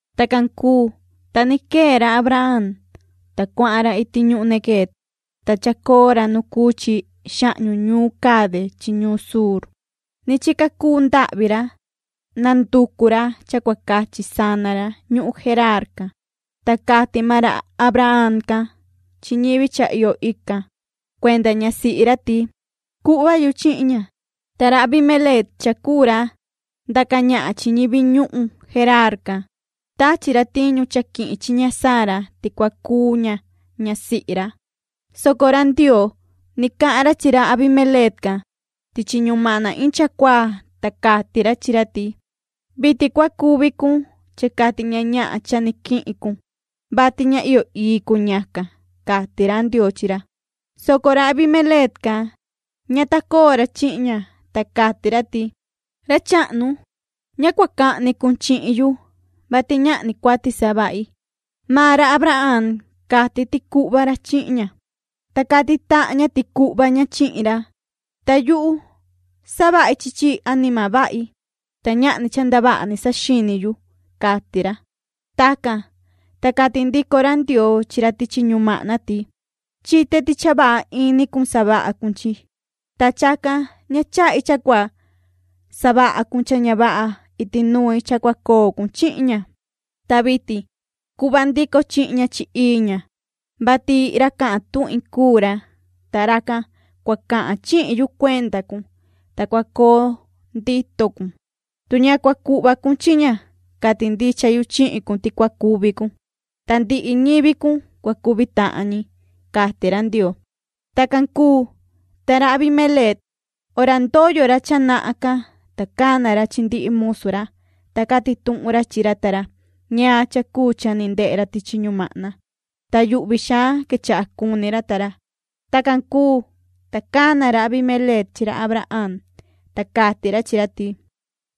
Tacan cuu, ta ni quee ra Abraham, ta cuahan ra iti ñuhun Neguev, ta chacoo ra nu cuu chi xahñu ñuun Cade chi ñuun Shur. Ni chica cuu ndahvi ra, nanducu ra cha cua cachi sana ra ñuhun Geraar can. Ta cati maan ra Abraham can chi ñivi cha iyo ican cuenda ñasihi ra ti: “Cuhva yu chihin ña”. Ta ra Abimeleec cha cuu ra ndaca ñahan chi ñivi ñuhun Geraar can, tachi ra tiñu cha quihin chi ña Sara ti cua cuu ña ñasihi ra, soco ra Ndioo ni cahan ra chi ra Abimeleec can tichi ñumahna iin chacuaa, ta cati ra chi ra ti: “Vitin cua cuvi cun cha cati ña ñahan cha ni quihin cun, vati ña iyo ii cuu ñacan”, cati ra Ndioo chi ra, soco ra Abimeleec can ña ta coo ra chihin ña, ta cati ra ti: “Ra chahnu, ña cua cahni cun chihin yu, vati ñahni cuati savahi. Maan ra Abraham cati ti cuhva ra chihin ña, ta cati tahan ña ti cuhva ña chihin ra. Ta yuhu savahi chi chi anima vahi, ta ñahni cha ndavaha ni saxini yu”, cati ra. Tacan, ta cati ndico ra Ndioo chi ra tichi ñumahna ti: “Chite ti cha vaha ini cun savaha cun chi. Ta chacan ña chahi cha cua savaha cun cha ña vaha iti nui cha cua coo cun chihin ña. Ta vitin cuhva ndico chihin ña chi ii ña, vati ra cahan cuenda yu cuu ra, ta racan cua cahan chihin yu cuenda cun, ta cua coo ndito cun. Tu ña cua cuhva cun chihin ña, cati ndicha yu chihin cun ti cua cuvi cun, ta ndihi ñivi cun cua cuvi tahan ñi”, cati ra Ndioo. Tacan cuu, ta ra Abimeleec hora ndoyo ra cha nahan can, ta cana ra chi ndihi musu ra, ta cati tuhun ra chi ra ta ra ñaan cha cuu cha ni ndehe ra tichi ñumahna, ta yuhvi xaan quechaha cuni ra ta ra. Tacan cuu, ta cana ra Abimeleec chi ra Abraham, ta cati ra chi ra ti: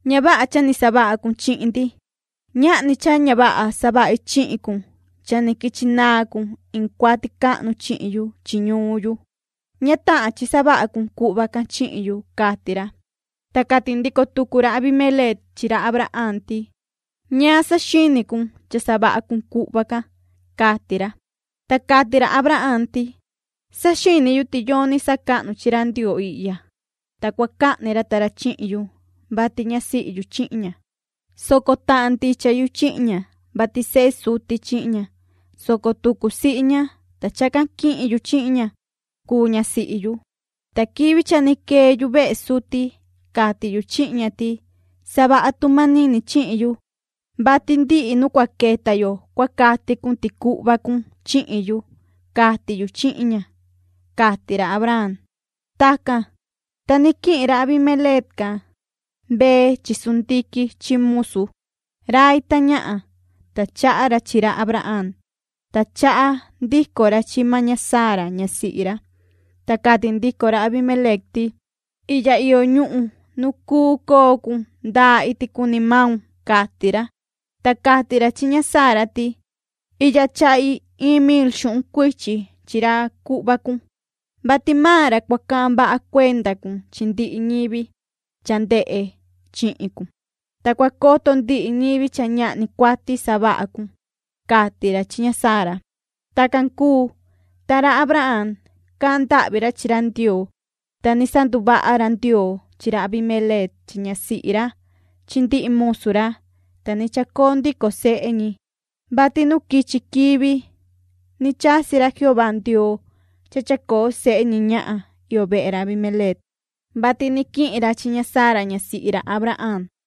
―Ña vaha cha ni savaha cun chihin ndi. Ñahni cha ña vaha savahi chihin cun cha ni quichi naan cun iin cuati cahnu chihin yu chi ñuun yu. Ña tahan chi savaha cun cuhva can chihin yu ―cati ra. Ta cati ndico tucu ra Abimeleec chi ra Abraham ti: ―¿Ñaan saxini cun cha savaha cun cuhva can? ―cati ra. Ta cati ra Abraham ti: ―Saxini yu ti yoni sacahnu chi ra Ndioo ihya, ta cua cahni ra ta ra chihin yu, vati ñasihi yu chihin ña, soco tahan ndicha yu chihin ña, vati sehe suti chi ña, soco tucu sihi ña, ta chacan quihin yu chihin ña cuu ñasihi yu. Ta quivi cha ni quee yuvehe suti, cati yu chihin ña ti:” Savaha tu manini chihin yu, vati ndihi nu cua queta yo cua cati cun ti cuhva cun chihin yu, cati yu chihin ña”, cati ra Abraham. Tacan, ta ni quihin ra Abimeleec can mbee chi chivu chi sundiquin chi musu, rai ta ñahan, ta chaha ra chi ra Abraham, ta chaha ndico ra chi maan ña Sara ñasihi ra. Ta cati ndico ra Abimeleec ti: ―Ihya iyo ñuhun nu cuu coo cun, cuu coo cun ndaa iti cuni maun ―cati ra. Ta cati ra chi ña Sara ti: ―Ihya chahi iin mil xuhun cuichi chi ra cuhva cun, vati maan ra cua cahan vaha cuenda cun chi ndihi ñivi cha ndehe chihin cun, ta cua coto ndihi ñivi cha ñahni cuati savaha cun ―cati ra chi ña Sara. Tacan cuu, ta ra Abraham cahan ndahvi ra chi ra Ndioo, ta ni sanduvaha ra Ndioo chi ra Abimeleec chi ñasihi ra chi ndihi musu ra, ta ni chacoo ndico sehe ñi, vati nu quichi quivi ni chasi ra Jehová Ndioo cha chacoo sehe ñi ñahan iyo vehe ra Abimeleec, vati ni quihin ra chi ña Sara ñasihi ra Abraham.